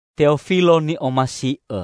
Teofilo ni'omasi'õ,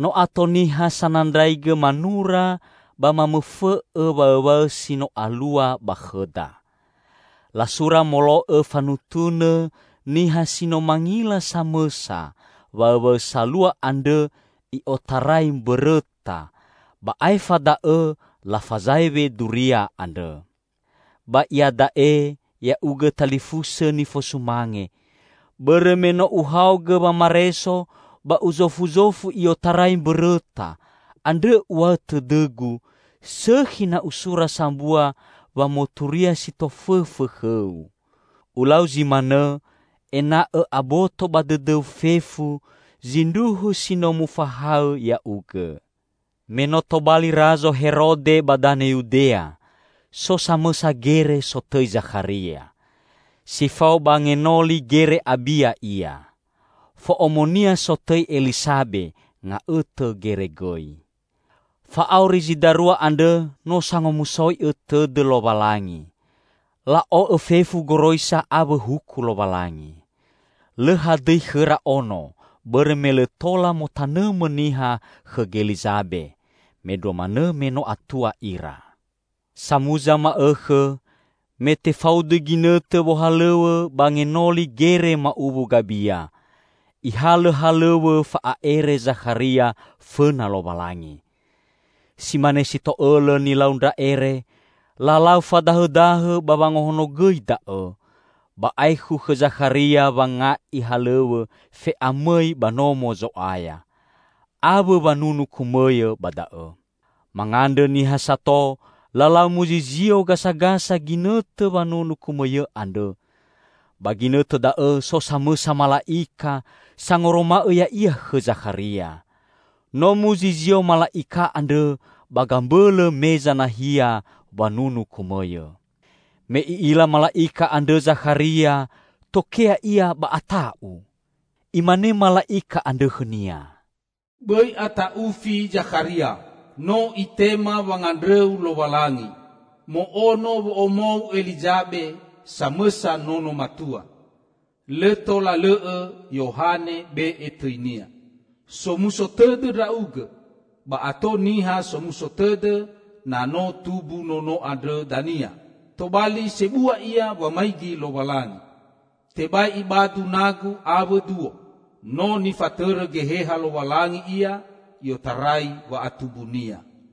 No ato niha sanandraigõ manura ba mamõfõ'õ waõwaõ si no alua ba khõda. Lasura molo'õ fanutunõ niha si no mangila samõsa waõwaõ salua andrõ i'otarai mbõrõta, ba aefa da'õ lafazaewe duria andrõ. Ba iada'e, ya'ugõ talifusõ nifosumange, bõrõ me no uhaogõ wamareso ba uzofuzofu i'otarai mbõrõta, andrõ uw̃a'õ tõdõgu, sõkhi na usura sambua wamoturia si tofõfõ khõu. Ulau zi manõ, ena'õ aboto ba dõdõu fefu zindruhu si no mufahaõ ya'ugõ. Me no tobali Razo Herode ba danõ Yudea, so samõsa gere sotõi Zakharia. Si fao ba ngenoli gere Abia ia. Fo'omonia sotõi Elisabe, nga'õtõ gere gõi. Fa'auri zi darua andrõ no sangomusoi'õ tõdõ Lowalangi. La'o'õ fefu goroisa awõ huku Lowalangi. Lõ hadõi khõra ono bõrõ me lõ tola motanõmõ niha khõ Gelizabe, mendrua manõ me no atua ira. Samuza ma'õkhõ, me tefaudu ginõtõ wohalõw̃õ ba ngenoli gere ma'uwu Gabia, ihalõ halõw̃õ fa'a'ere Zakharia fõna Lowalangi. Si mane si to'õlõ nilau ndra ere, lalau fadahõdahõ ba wangahonogõi da'õ. Ba aekhu khõ Zakharia wanga'i halõw̃õ fe'amõi ba Nomo Zo'aya, awõ wanunu kumõyõ ba da'õ. Mangandrõ niha sato, lalau muzizio gasagasa ginõtõ wanunu kumõyõ andrõ. Ba ginõtõ da'õ so samõsa mala'ika sangoroma'õ ya'ia khõ Zakharia. No muzizio mala'ika andrõ ba gambõlõ meza nahia wanunu kumõyõ. Me i'ila mala'ika andrõ Zakharia, tokea ia ba ata'u. Imane mala'ika andrõ khõnia, "Bõi ata'ufi, Zakharia! No Itema wangandrõu Lowalangi. Mo'ono wo'omou Elizabe, samõsa nono matua. Lõ tola lõ'õ Yohane be'e tõinia. Somuso tõdõ ndra'ugõ, ba ato niha somuso tõdõ na no tumbu nono andrõ dania! Tobali sebua ia wamaigi Lowalangi. Tebai ibadu nagu awõ duo. No nifatõrõ Geheha Lowalangi ia i'otarai wa'atumbunia.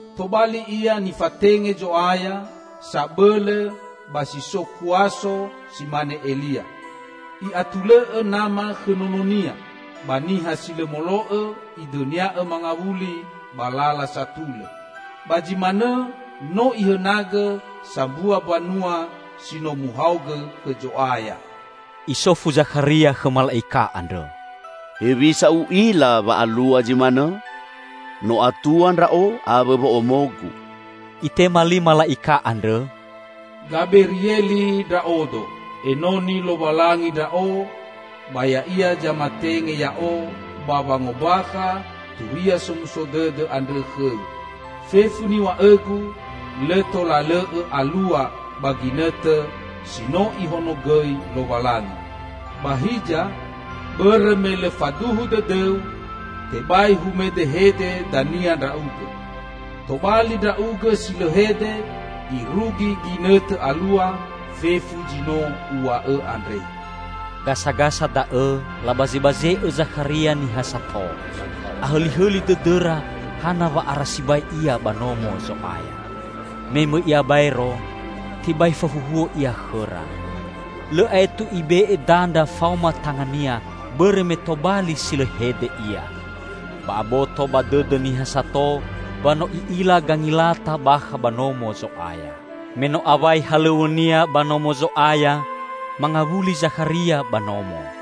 Tobali ia nifatenge Zo'aya sabõlõ ba si so kuaso si mane Elia. I'atulõ'õ nama khõ nononia, ba niha si lõ molo'õ idõnia'õ mangawuli ba lala satulõ. Ba zi manõ no ihõnagõ sambua mbanua si no muhaogõ khõ Zo'aya." Isofu Zakharia khõ mala'ika andrõ, "Hewisa u'ila wa alua zi manõ? No atua ndra'o awõ wo'omogu." Itema li mala'ika andrõ, "Gaberieli ndra'odo. Enoni Lowalangi ndra'o ba Ya'ia zamatenge ya'o ba wangombakha turia somuso dõdõ andrõ khõu. Fefu niw̃a'õgu lõ tola lõ'õ alua ba ginõtõ si no Ihonogõi Lowalangi. Ba hiza, bõrõ me lõ faduhu dõdõu, tebai humedehede dania ndra'ugõ; tobali ndra'ugõ si lõ hede irugi ginõtõ alua fefu zi no uw̃a'õ andre." Gasagasa da'õ, labazebaze'õ Zakharia niha sato. Ahõlihõli dõdõra hana wa'ara sibai ia ba Nomo Zo'aya. Me mõi ia baero, tebai fahuhuo ia khõra. Lõ aetu ibe'e dandra faoma tangania, bõrõ me tobali si lõ hede ia. Ba aboto ba dõdõ niha sato wa no i'ila gangilata bakha ba Nomo Zo'aya. Me no awai halõw̃õnia ba Nomo Zo'aya, mangawuli Zakharia ba nomo.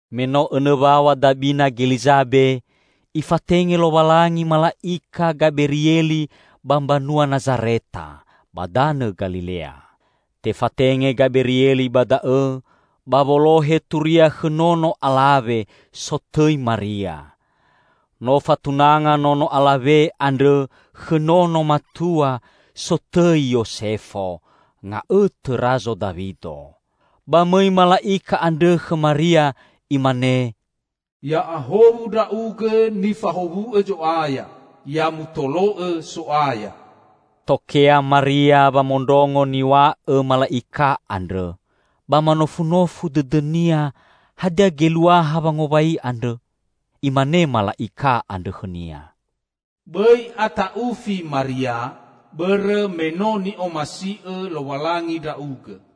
Me no õnõ waw̃a dabina Gelizabe, Ifatenge Lowalangi mala'ika Gaberieli ba mbanua Nazareta, ba danõ Galilea. Tefatenge Gaberieli ba da'õ, ba wolohe turia khõ nono alawe, sotõi Maria. No fatunanga nono alawe andrõ khõ nono matua, sotõi Yosefo, nga'õtõ Razo Dawido. Ba mõi mala'ika andrõ khõ Maria imane, "Ya'ahowu ndra'ugõ nifahowu'õ Zo'aya! Ya mutolo'õ So'aya!" Tokea Maria wamondrongo niw̃a'õ mala'ika andrõ, ba manofunofu dõdõnia, hadia geluaha wangowai andrõ. Imane mala'ika andrõ khõnia, "Bõi ata'ufi Maria, bõrõ me no ni'omasi'õ Lowalangi ndra'ugõ.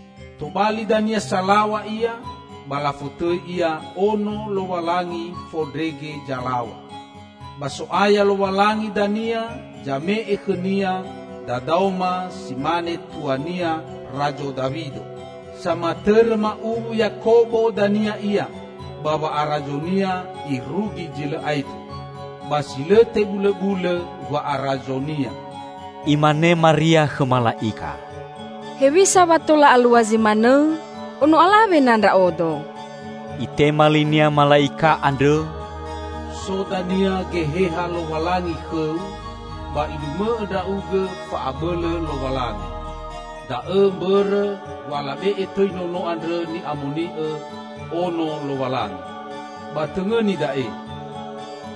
Tobali dania Salaw̃a Ia ba lafotõi Ia Ono Lowalangi Fondrege Zalaw̃a. Ba So'aya Lowalangi dania zame'e khõ-Nia dadaoma si mane tua-Nia Razo Dawido. Samatõrõ ma'uwu Yakobo dania Ia ba wa'arazo-Nia irugi zi lõ aetu. Ba si lõ tebulõbulõ wa'arazo-Nia." Imane Maria khõ mala'ika, "Hewisa wa tola alua zi manõ? Ono alawe na ndra'odo." Itema linia mala'ika andrõ, "So dania Geheha Lowalangi khõu, ba Ilumõ'õ ndra'ugõ fa'abõlõ Lowalangi. Da'õ mbõrõ wa labe'e tõi nono andrõ Ni'amoni'õ, Ono Lowalangi. Ba tõngõni da'e: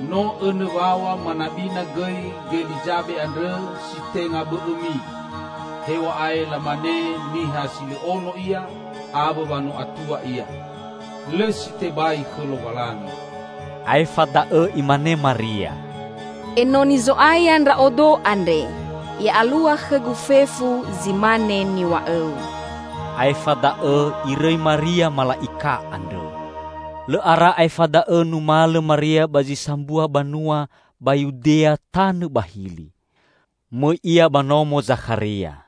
No õnõ waw̃a manabina gõi Gelizabe andrõ si tenga bõ'õmi, hew̃a'ae lamane niha si lõ ono ia awõ wa no atua ia. Lõ si tebai khõ Lowalangi." Aefa da'õ imane Maria, "Enoni Zo'aya ndra'odo andre; ya'alua khõgu fefu zi mane niw̃a'õu." Aefa da'õ irõi Maria mala'ika andrõ. Lõ ara aefa da'õ numalõ Maria ba zi sambua banua ba Yudea tanõ ba hili. Mõi ia ba nomo Zakharia.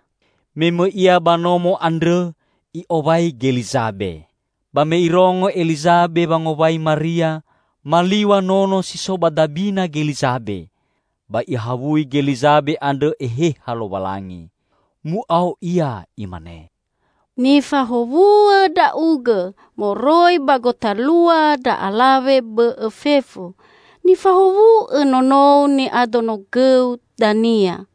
Me mõi ia ba nomo andrõ i'owai Gelizabe. Ba me irongo Elizabe wangowai Maria, maliw̃a nono si so ba dabina Gelizabe. Ba Ihawui Gelizabe andrõ Eheha Lowalangi. Mu'ao ia imane, "Nifahowu'õ ndra'ugõ moroi ba gotalua ndra alawe bõ'õ fefu! Nifahowu'õ nono ni'adonogõu dania!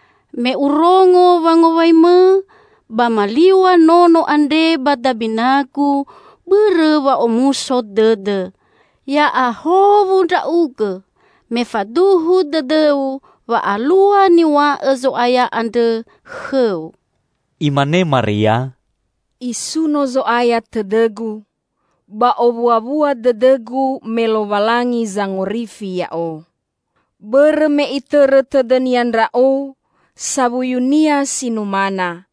Me urongo wangowaimõ, ba maliw̃a nono andre ba dabinagu bõrõ wa'omuso dõdõ. Ya'ahowu ndra'ugõ, me faduhu dõdõu wa alua niw̃a'õ Zo'aya andrõ khõu!" Imane Maria, "Isuno Zo'aya tõdõgu, ba owuawua dõdõgu me Lowalangi Zangorifi ya'o. Bõrõ me Itõrõ tõdõ-Nia ndra'o, sawuyu-Nia si numana!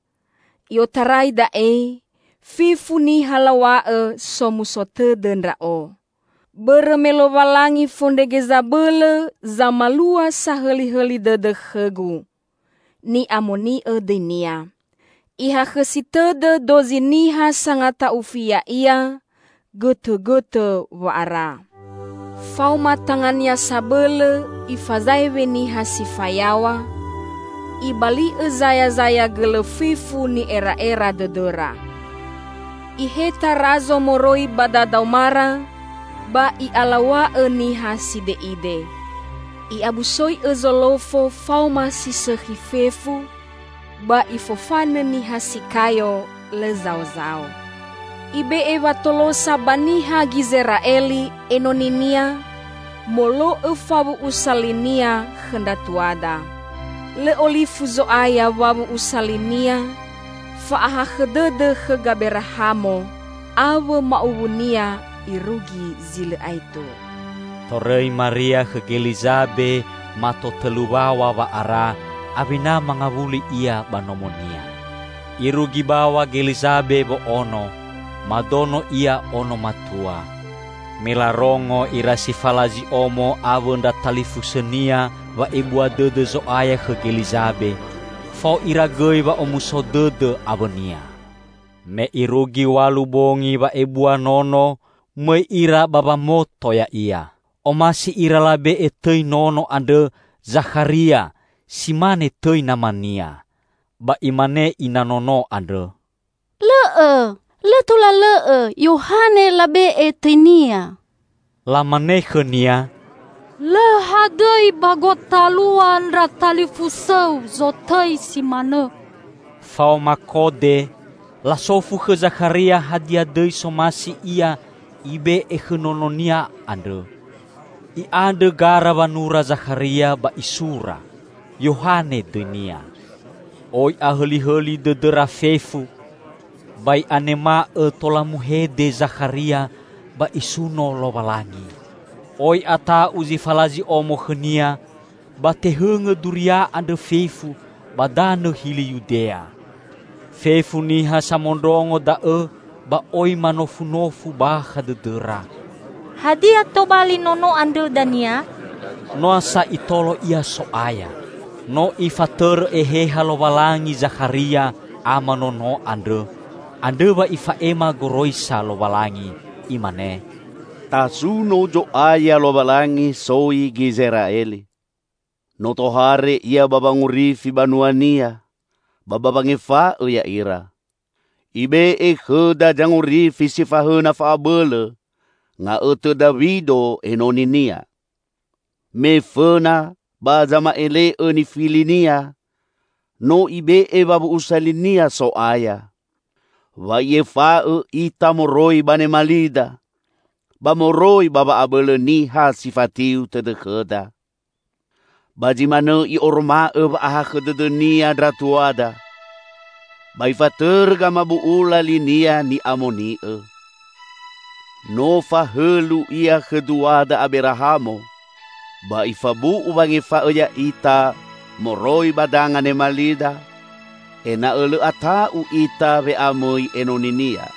I'otarai da'e, fefu niha law̃a'õ somuso tõdõ ndra'o. Bõrõ me Lowalangi Fondrege Zabõlõ zamalua sahõlihõli dõdõ khõgu. Ni'amoni'õ dõi-Nia. Ihakhõsi tõdõ dozi niha sangata'ufi Ya'ia, gõtõgõtõ wa'ara. Faoma tanga-Nia Sabõlõ Ifazaewe niha si fayaw̃a, Ibali'õ zayazaya gõlõ fefu ni'era'era dõdõra. Iheta razo moroi ba dadaomara ba I'alaw̃a'õ niha side'ide. I'abusoi'õ zolofo faoma si sõkhi fefu ba Ifofanõ niha si kayo lõ zaozao. Ibe'e watolosa ba niha Gizera'eli, enoni-Nia, molo'õ fawu'usa li-Nia khõ ndra tuada. Lõ olifu Zo'aya wawu'usa li-Nia fa'akhõ dõdõ khõ Gaberahamo awõ ma'uwunia irugi zi lõ aetu." Torõi Maria khõ Gelizabe mato tõlu waw̃a wa'ara, awena mangawuli ia ba nomonia. Irugi baw̃a Gelizabe wo'ono. Madono ia ono matua. Me larongo ira si falazi omo awõ ndra talifusõnia wa'ebua dõdõ Zo'aya khõ Gelizabe, fao ira gõi wa'omuso dõdõ awõnia. Me irugi w̃alu bongi wa'ebua nono, mõi ira ba wamoto ya'ia. Omasi ira labe'e tõi nono andrõ Zakharia si mane tõi namania, ba imane ina nono andrõ, "Lõ'õ! Lõ tola lõ'õ Yohane labe'e tõinia." Lamane khõnia, "Lõ hadõi ba gotalua ndra talifusõu zotõi si manõ." Faoma kode, lasofu khõ Zakharia hadia dõi somasi ia ibe'e khõ nononia andrõ. I'andrõ gara wanura Zakharia ba isura, "Yohane dõinia." Oi ahõlihõli dõdõra fefu. Ba i'anema'õ tola muhede Zakharia ba isuno Lowalangi. Oi ata'u zi falazi omo khõnia, ba tehõngõ duria andrõ fefu ba danõ hili Yudea. Fefu niha samondrongo da'õ ba oi manofunofu bakha dõdõra, "Hadia tobali nono andrõ dania?" Noa sa Itolo ia So'aya. No Ifatõrõ Eheha Lowalangi Zakharia, ama nono andrõ, andrõ wa ifa'ema goroisa Lowalangi. Imane, "Tasuno Zo'aya Lowalangi soi Gizera'eli. No tohare Ia ba wangorifi banua-Nia ba ba wangefa'õ ya'ira. Ibe'e khõda zangorifi si fahõna fa'abõlõ, nga'õtõ Dawido enoni-Nia. Me fõna ba zama'ele'õ nifili-Nia, no Ibe'e wawu'usa li-Nia So'aya. Wa I'efa'õ ita moroi ba nemalida, ba moroi ba wa'abõlõ niha si fatiu tõdõ khõda. Ba zi manõ I'oroma'õ wa'ahakhõ dõdõ-Nia ndra tuada, ba Ifatõrõ gamabu'ula li-Nia ni'amoni'õ. No fahõlu Ia khõ duada Aberahamo, ba Ifabu'u wangefa'õ ya'ita moroi ba danga nemalida, ena'õ lõ ata'u ita we'amõi enoni-Nia.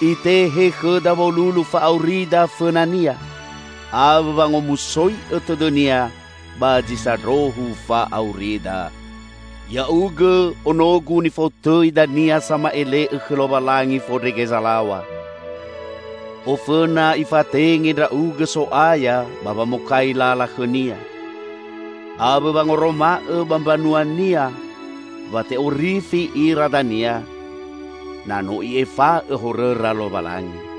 Itehe khõda wolulu fa'aurida fõna-Nia awõ wangomusoi'õ tõdõ-Nia ba zi sandrohu fa'aurida. Ya'ugõ, onogu, nifotõi dania Sama'ele'õ khõ Lowalangi Fondrege Zalaw̃a. Ofõna Ifatenge ndra'ugõ So'aya ba wamokai lala khõ-Nia. Awõ wangoroma'õ ba mbanua-Nia wa te'orifi ira dania, na no I'efa'õ horõra Lowalangi.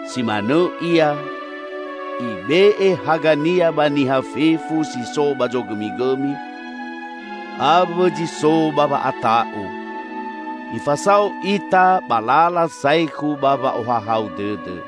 si manõ Ia, Ibe'e haga-Nia ba niha fefu si so ba zogõmigõmi awõ zi so ba wa'ata'u. Ifasao ita ba lala saekhu ba wa'ohahau dõdõ."